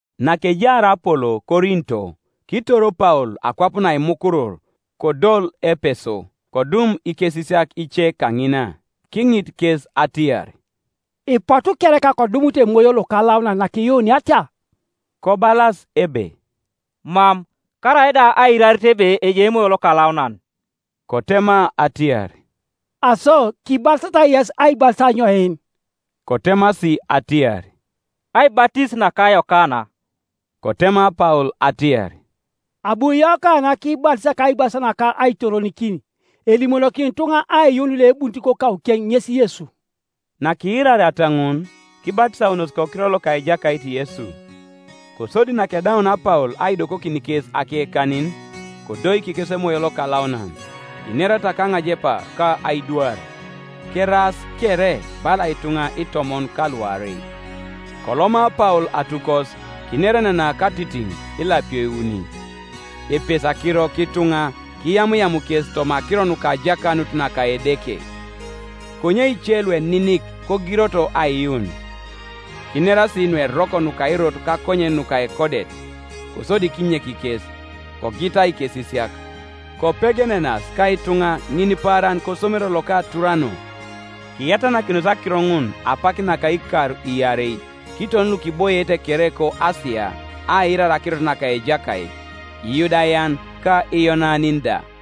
Nakejaar Apolo Korinto, kitor Paul akwap naimukurur, kodol Epeso. Kodum ikesisiak ice kaŋina. Kiŋit kes atiar, “Ipotu kereka ko dumut Emoyo Lokalaunan nakiyuuniata?” Kobalas ebe, “Mam, karaida aiirarit ebe ejai Emoyo Lokalaunan.” Kotema atiar, “Aso kibatisatai yes aibatis anyoin?” Kotemasi atiar, “Aibatis naka Yokana.” Kotema Paul atiar, “Abu Yokana kibatis kaibatis naka aitoronikin, elimonokin ituŋa aiyuun loebunit kokaukeŋ ŋes Yesu.” Nakiirariata ŋun, kibatisaunos kokiror loka Ejakait Yesu. Kosodi nakedaunia Paul aidokokin kes akekanin, kodoik kes Emoyo Lokalaunan; kinerata kaŋajepa, ka aidwar. Keraas kere bala ituŋa itomon ka luarei. Koloma Paul atukos, kinerenena katitiŋ ilapio iuni, epesi akiro kituŋa kiyamuyam kes toma akiro nuka ajakanut naka Edeke. Konye ice lueninik kogiroto aiyuun, kinerasi nueroko nuka Erot kakonyen nuka ekodet, kosodi kinyek kes, kogita ikesisiak, kopegenenas ka ituŋa ŋinipaaran kosomero loka Turano. Kiyatanakinos akiro ŋun apak naka ikar iarei; kiton lukiboiete kere koAsia aiirar akirot naka Ejakait, Iyudayan ka Iyonanin da.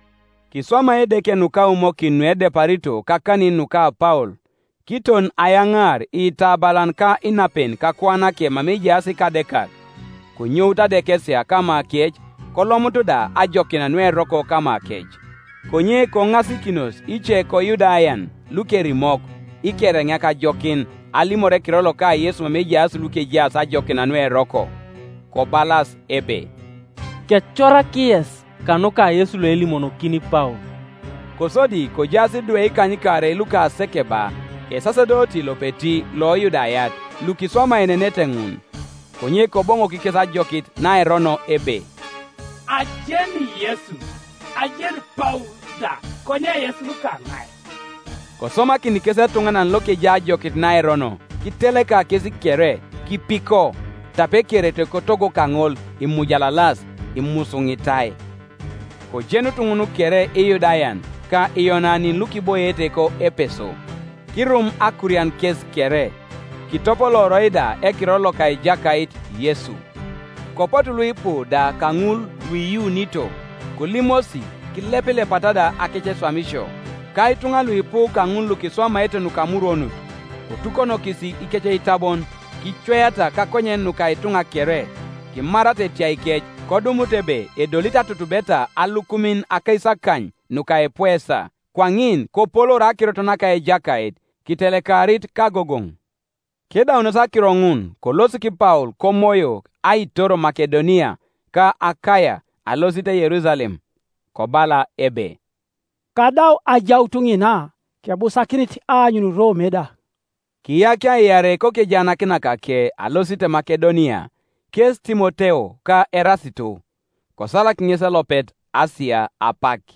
Kiswama Edeke nukaumokin nuedeparito kakanin nuka Paul, kiton ayaŋaar iitabalan ka inapen kakuanake mama ejaas ikadekak, konyout adekesia kamakec, kolomut da ajokin nueroko kamakec. Konye koŋasikinos ice koYudayan lukerimok, ikereŋeak ajokin, alimor ekiror loka Yesu mama ejaas lukejaas ajokin nueroko, kobalas ebe, “Kecorak yes kanuka Yesu loelimonokini Paul.” Kosodi kojaas idwe ikanykaarei luka Sekeba esasedoti lopeti loYudayat, lukiswamaenenete ŋun. Konye Koboŋok kes ajokit naerono ebe, “Ajeni Yesu, ajeni Paul da; konye yes lukaŋai?” Kosomakin kes etuŋanan lokejai ajokit naerono, kiteleka kes kere, kipiko, tape ekerete kotogo kaŋol imujalalas, imusuŋitai. Kojenut ŋun kere Iyudayan ka Iyonanin lukiboiete ko Epeso; kirum akurian kes kere; kitopolooroi da ekiror loka Ejakait Yesu. Kopotu luipu da kaŋul luiyuunito, kolimosi, kilepilepata da akeceswamisio. Ka ituŋa luipu kaŋul lukiswamaete nukamurwonut, kotukonokis ikeceitabon, kicweata kakonyen nuka ituŋa kere; kimarata etiaikec, kodumut ebe edolit atutubeta alukumin akaisakany nuka epuesa. Kwaŋin kopoloor akirot naka Ejakait, kitelekarit kagogoŋ. Kedaunos akiro ŋun kolosik Paul Komoyo aitor Makedonia ka Akaia alosit Yerusalem, kobala ebe, “Kadau ajaut ŋina, kebusakinit aanyun Rome da.” Kiyakia iarei kokejaanakinakake alosit Makedonia, kes Timoteo ka Erasito, kosalak ŋes elopet Asia apak.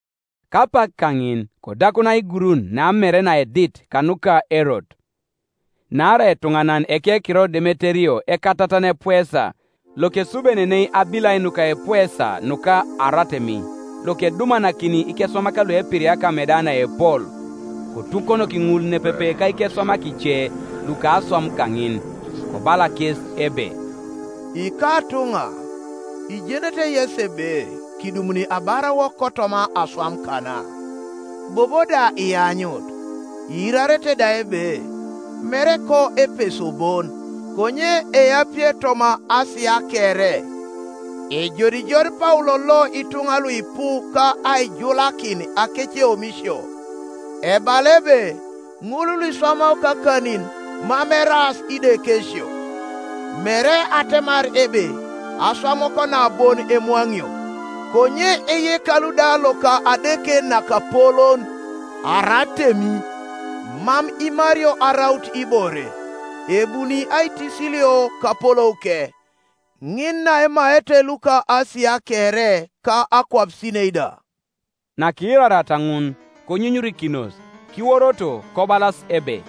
Kapak kaŋin kodakun aigurun namere naedit kanuka Erot. Naarai etuŋanan ekekiror Demeterio ekatatan epuesa, lokesubenenei abilai nuka epuesa nuka Aratemi, lokedumanakini ikeswamak luepiriaka ameda naepol; kotukonoki ŋul nepepe ka ikeswamak ice luka aswam kaŋin, kobala kes ebe, “Ikatuŋa, ijenete yesi ebe kidumuni abarawok kotoma aswam kana. Bobo da ianyut, iirarete da ebe, mere koEpeso bon, konye eapie toma Asia kere, ejodijod Paul lo ituŋa luipu ka aijulakin akeceomisio, ebala ebe ŋulluiswamao kakanin mam eraas idekesio: mere atemar ebe aswamuwok na bon emwaŋio, konye eyekalu da loka adeke nakapolon Aratemi mam imario araut ibore, ebuni aitisilio kapolouke, ŋin naemaete luko Asia kere ka akwapisinei da.” Nakiirariata ŋun konyunyurikinos, kiworoto kobalas ebe,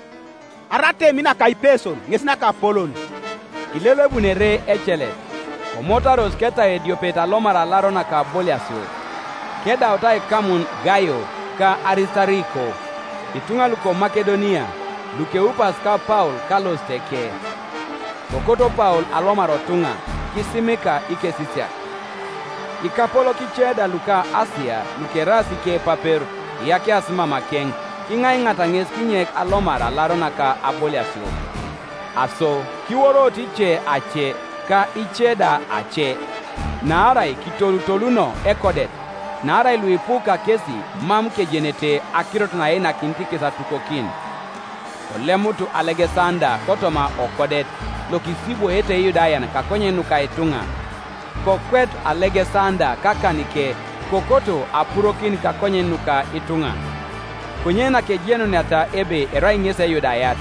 “Aratemi naka Ipeson ŋes nakapolon!” Kilelebun ere ecelet; komotaros ketau ediopet alomar alaro naka aboliasio, kedaut aikamun Gaio ka Arisitariko, ituŋa luko Makedonia, lukeupas ka Paul kalositeke. Kokoto Paul alomar otuŋa, kisimika ikesisiak. Ikapolok ice da luka Asia, lukeraas ikepapero kiyakiasi mamakeŋ, kiŋaiŋaata ŋes kinyek alomar alaro naka aboliasio, Aso kiworoto ice ace, ka ice da ace; naarai kitolutoluno ekodet; naarai luipu kakesi mam kejenete akirot naeinakinit kes atukokin. Kolemut Alegesanda kotoma okodet, lokisibwoete Iyudayan kakonyen nuka ituŋa. Kokwetu Alegesanda kakanike, kokoto apurokin kakonyen nuka ituŋa. Konye nakejenuniata ebe erai ŋesi Eyudayat,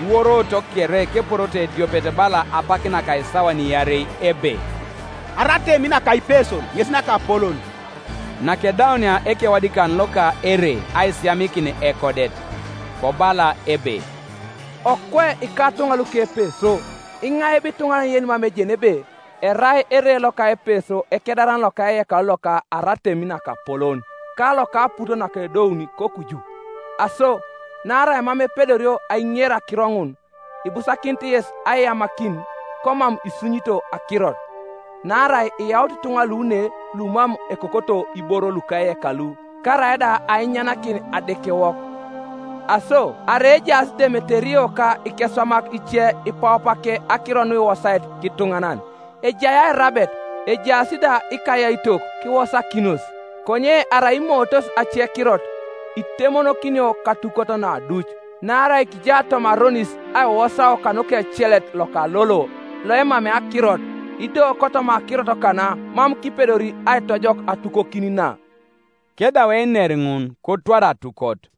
kiworoto kere keporoto ediopet bala apak naka isawan iarei ebe, “Aratemi naka Ipeson ŋes nakapolon!” Nakedaunia ekewadikan loka ere aisiyamikin ekodet, kobala ebe, “Okwe ikatuŋa luko Epeso, iŋai bo ituŋanan yenimam ejeni ebe, erai ere loka Epeso ekedaran loka eyekalu loka Aratemi nakapolon, ka loka aput nakedouni kokuju? Aso naarai mam epedorio aiŋer akiro ŋun, ibusakinit yes aiyamakin, komam isunyito akirot, Naarai iyaut ituŋa lu ne lumam ekokoto iboro luka eyekalu, karaida ainyanakin adekewok. Aso arai ejaas Demeterio ka ikeswamak ice ipaupake akiro nuiwosaete kituŋanan, ejai airabet, ejaas da ikayaitok; kiwosakinos. Konye arai imootos acekirot, itemonokinio katukot naduc. Naarai kija toma aronis aiwosao kanuka ecelet loka lolo, loemamei akirot; ido kotoma akirot kana mam kipedori aitojok atukokin na.” Kedau einer ŋun kotwar atukot.